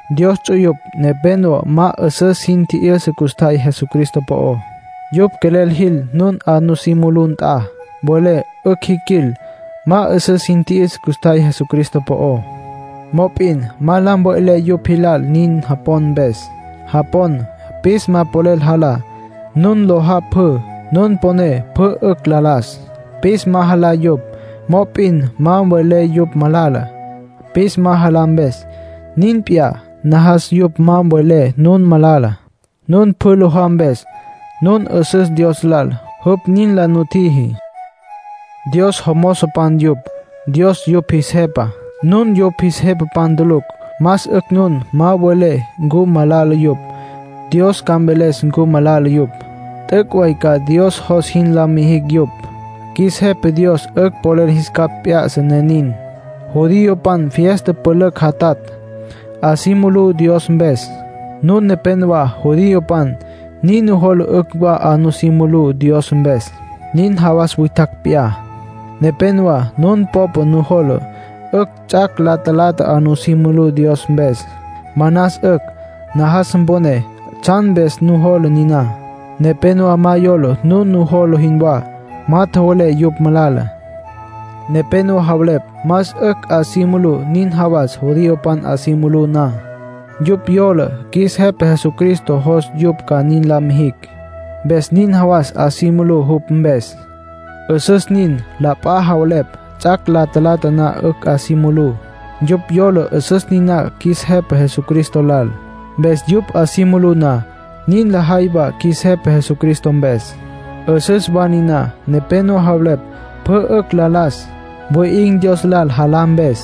Dios ts'uyupj nepénowa ma 'üsüs sin tji'yüsa custjay Jesucristo po'ó. Yupj quelel jil nun 'a nusí mulú nt'a. Mvelé 'ücj jiquil. Ma 'üsüs sin tji'yüsa custjay Jesucristo po'ó, mop'in ma la mve'lé yupj jilal nin japon mpes. Japon pis ma polel jalá. Nun lojá pjü, nun poné pjü 'ücj la las. Pis ma jalá yupj. Mop'in ma mvelé yupj malala, pis ma jalá mpes. Nin p'iyá, najas yupj ma mvelecj nun malala, nun pjü lojá mpes. Nun 'üsüs Dios lal, jupj nin la nutjiji. Dios jomozopan yupj. Dios yupj jis Jepa. Nun yupj jis jepapan tulucj. Más 'ücj nun ma welé ncu malala yupj. Dios ca mveles ncu malala yupj. T'üc' way ca Dios jos jin la mijicj yupj; qjuis Jepa Dios 'ücj polel jis capj p'ya'sa, ne nin. Judiopan fiesta pülücj jatatj, 'a si mulú Dios mpes. Nun nepénowa judiopan; nin nujola 'ücj wa 'a nusí mulú Dios mpes, nin jawas witjacj p'iyá. Nepénowa nun popa nujola 'ücj ts'ac' la talata 'a nu mulus Dios mpes. Manas 'ücj. Najas mponé tsjan mpes nujola niná. Nepénowa ma yola nun nujola jinwá. Ma tjowelé yupj malala. Nepénowa javelepj más 'ücj 'a si mulú nin jawas judiopan 'a si mulú na. Yupj yola qjuis Jepa Jesucristo jos yupj ca nin la mijicj. Mpes nin jawas 'a si mulú jupj mpes. 'Üsüs nin. La p'a wa javelepj ts'ac' la talata na 'ücj 'a si mulú. Yupj yola 'üsüs niná qjuis Jepa Jesucristo lal. Mpes yupj 'a si mulú na, nin lajay wa qjuis Jepa Jesucristo mpes. 'Üsüs wa niná. Nepénowa javelepj pjü 'ücj la las. Wi'in̈ Dios lal jalá mpes.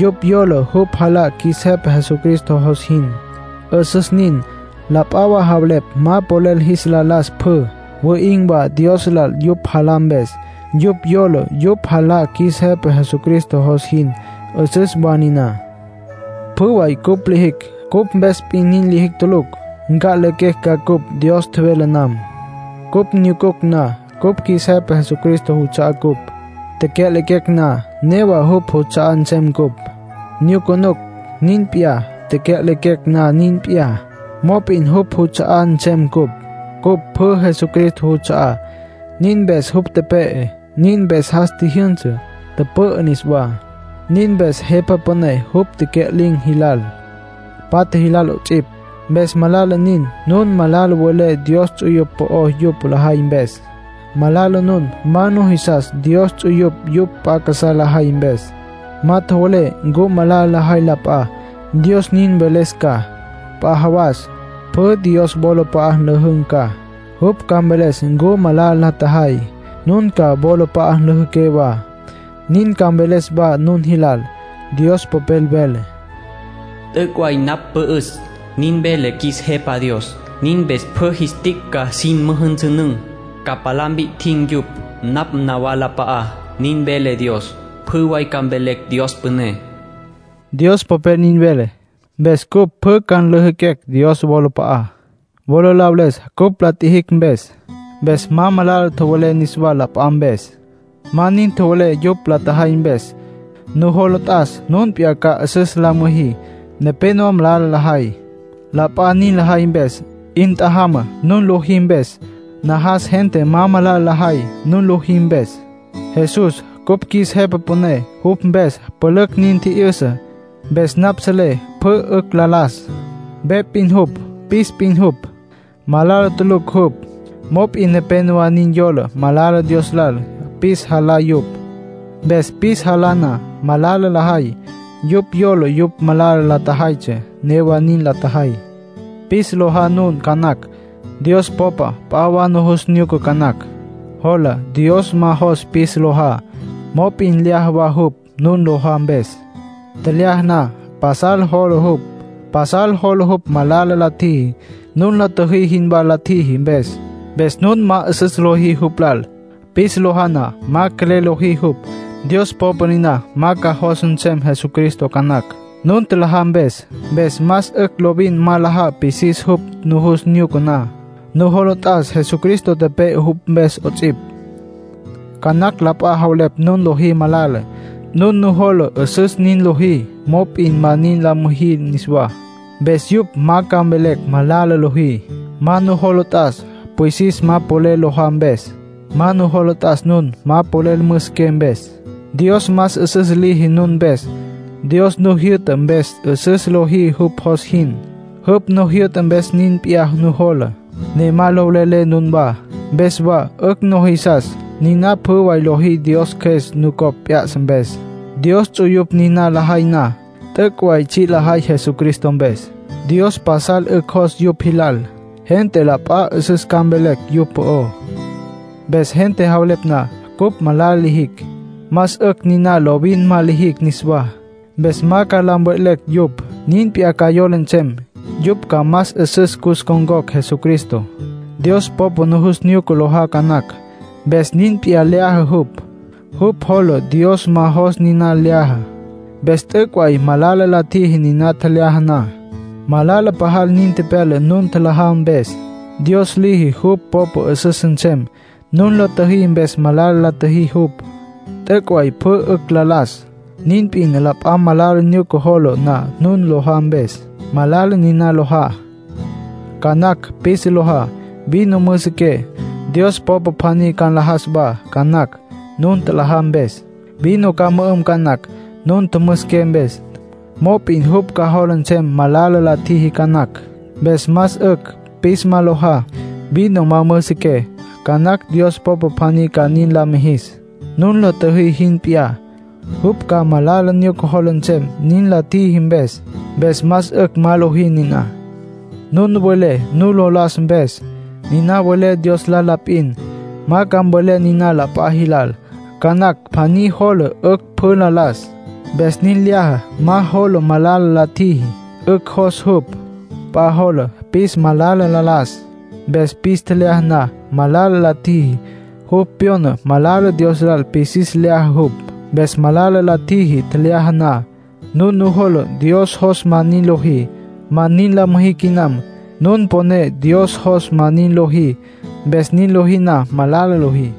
Yupj yola yupj jalá qjuis Jepa Jesucristo jos jin. 'Üsüs nin. La p'a wa javelepj ma polel jis la las pjü. Wi'in̈ wa Dios lal yupj jalá mpes. Yupj yola yupj jalá qjuis Jepa Jesucristo jos jin. 'Üsüs wa niná. Pjü way cupj lijicj, cupj mpes p'in nin lijicj tulucj. Nca'lequecj ca cupj Dios tjevele nam. Cupj nyucunucj na, cupj qjuis Jepa Jesucristo juts'a'á cupj. Tecya'lequecj na, newa jupj juts'a'á nsem cupj. Nyucunucj, nin p'iyá, tecya'lequecj na, nin p'iyá; mop'in jupj juts'a'á nsem cupj. Cupj pjü Jesucristo juts'a'á. Nin mpes jupj tepe'e, nin mpes jas tjijyünsa, tüpü'ü niswá. Nin mpes Jepa Püné jupj tecya'lin̈ jilal, patja jilal 'ots'ipj. Mpes malala nin nun malala welé Dios ts'uyupj po'ó yupj lajay mpes. Malala nun ma nujisas Dios ts'uyupj yupj p'a casá lajay mpes. Ma tjowelé ncu malala la tjajay la p'a. Dios nin mveles ca. P'a jawas pjü Dios wolap'a'a nlüjün̈ ca. Jupj ca mveles ncu malala la tjajay. Nun ca wolap'a'a nlüjüqué wa. Nin ca mveles wa nun jilal. Dios Popel vele: “T'üc' way napj pü'üs, nin vele qjuis Jepa Dios. Nin mpes pjü jis tic' ca jin müjünsünün̈, ca palá mpi'tjin̈ yupj napj nawalap'a'á, nin vele Dios. Pjü way ca mvelecj Dios püné”, Dios Popel nin vele. Mpes cupj pjü ca nlüjüquecj Dios wolap'a'á, wola la veles cupj la tjijicj mpes. Mpes ma malala tjowelé niswá la p'a mpes. Ma nin tjowelé yupj la tjajay mpes. Nujola t'as nun p'iyá ca 'üsüs la müjí. Nepénowa malala lajay, la p'a nin lajay mpes. 'In tjajama nun lojí mpes. Najas gente ma malala lajay, nun lojí mpes. Jesús cupj qjuis Jepa Püné, jupj mpes pülücj nin tji'yüsa. Mpes napj selé pjü 'ücj la las. Ve p'in jupj, pis p'in jupj; malala tulucj jupj. Mop'in nepénowa nin yola malala Dios lal pis jalá yupj. Mpes pis jalá na, malala lajay; yupj yola yupj malala lajaytsja, newa nin la tjajay. Pis lojá nun ca nacj. Dios popa p'a wa nujus nyuca ca nacj. Jola Dios ma jos pis lojá. Mop'in lyaja wa jupj nun lojá mpes. Tjelyaja na pasal jola jupj. Pasal jola jupj malala la tjiji, nun la tjüjí jinwá la tjiji mpes. Mpes nun ma 'üsüs lojí jupj lal, pis lojá na; ma quelel lojí jupj. Dios popa niná ma ca jos nsem Jesucristo ca nacj, nun tjalajá mpes. Mpes más 'ücj lovin ma nlajá pisis jupj nujus nyuca na. Nujola t'as Jesucristo tepe'e jupj mpes 'ots'ipj. Ca nacj la p'a javelepj nun lojí malala. Nun nujola 'üsüs nin lojí. Mop'in ma nin la müjí niswá. Mpes yupj ma ca mvelecj malala lojí. Ma nujola t'as pwisis ma polel lojá mpes. Ma nujola t'as nun ma polel müsiqué mpes. Dios más 'üsüs liji nun mpes. Dios nu jyü'ta mpes 'üsüs lojí jupj jos jin. Jupj nu jyü'ta mpes nin p'iyá nujola, ne ma lo velelé nunwá. Mpes wa 'ücj nujisas. Niná pjü way lojí Dios Cjües nucopj p'ya'sa mpes. Dios ts'uyupj niná lajay na, t'üc' way tsji' lajay Jesucristo mpes. Dios pasal 'ücj jos yupj jilal. Gente la p'a 'üsüs ca mvelecj yupj po'ó. Mpes gente javelepj na cupj malala lijicj, más 'ücj niná lovin ma lijicj niswá. Mpes ma ca la mve'lecj yupj. Nin p'iyá ca yola nsem. Yupj ca más 'üsüs cus ncon̈cocj Jesucristo. Dios popa nujus nyuca lojá ca nacj, mpes nin p'iyá lyaja jupj. Jupj jola Dios ma jos niná lyaja, mpes t'üc' way malala la tjiji niná tjelyaja na. Malala pajal nin tepyala nun tjalajá mpes. Dios liji jupj popa 'üsüs nsem; nun la tjüjí mpes malala la tjiji jupj. T'üc' way pjü 'ücj la las. Nin p'in la p'a malala nyuca jola na nun lojá mpes, malala niná lojá. Ca nacj pis lojá, vino müsiqué. Dios popa pjaní ca nlajas wa ca nacj, nun tjalajá mpes. Vino ca mü'üm ca nacj, nun tjümüsiqué mpes. Mop'in jupj ca jola nsem malala la tjiji ca nacj. Mpes más 'ücj pis ma lojá, vino ma müsiqué. Ca nacj Dios popa pjaní ca nin la mijis, nun la tjüjí jin p'iyá. Jupj ca malala nyuca jola nsem nin la tjiji mpes. Mpes más 'ücj ma lojí niná. Nun welé nu lo las mpes, niná mvelé Dios lal la p'in. Ma ca mvelé niná p'a jilal. Ca nacj pjaní jola 'ücj pjü la las. Mpes nin lyaja. Ma jola malala la tjiji. 'Ücj jos jupj. P'a jola pis malala la las. Mpes pis tjelyaja na, malala la tjiji. Jupj pyona malala Dios lal pis lyaja jupj, mpes malala la tjiji tjelyaja na. Nun nujola Dios jos ma nin lojí, ma nin la müjí quinam. Nun poné Dios jos ma nin lojí, mpes nin lojí na, malala lojí.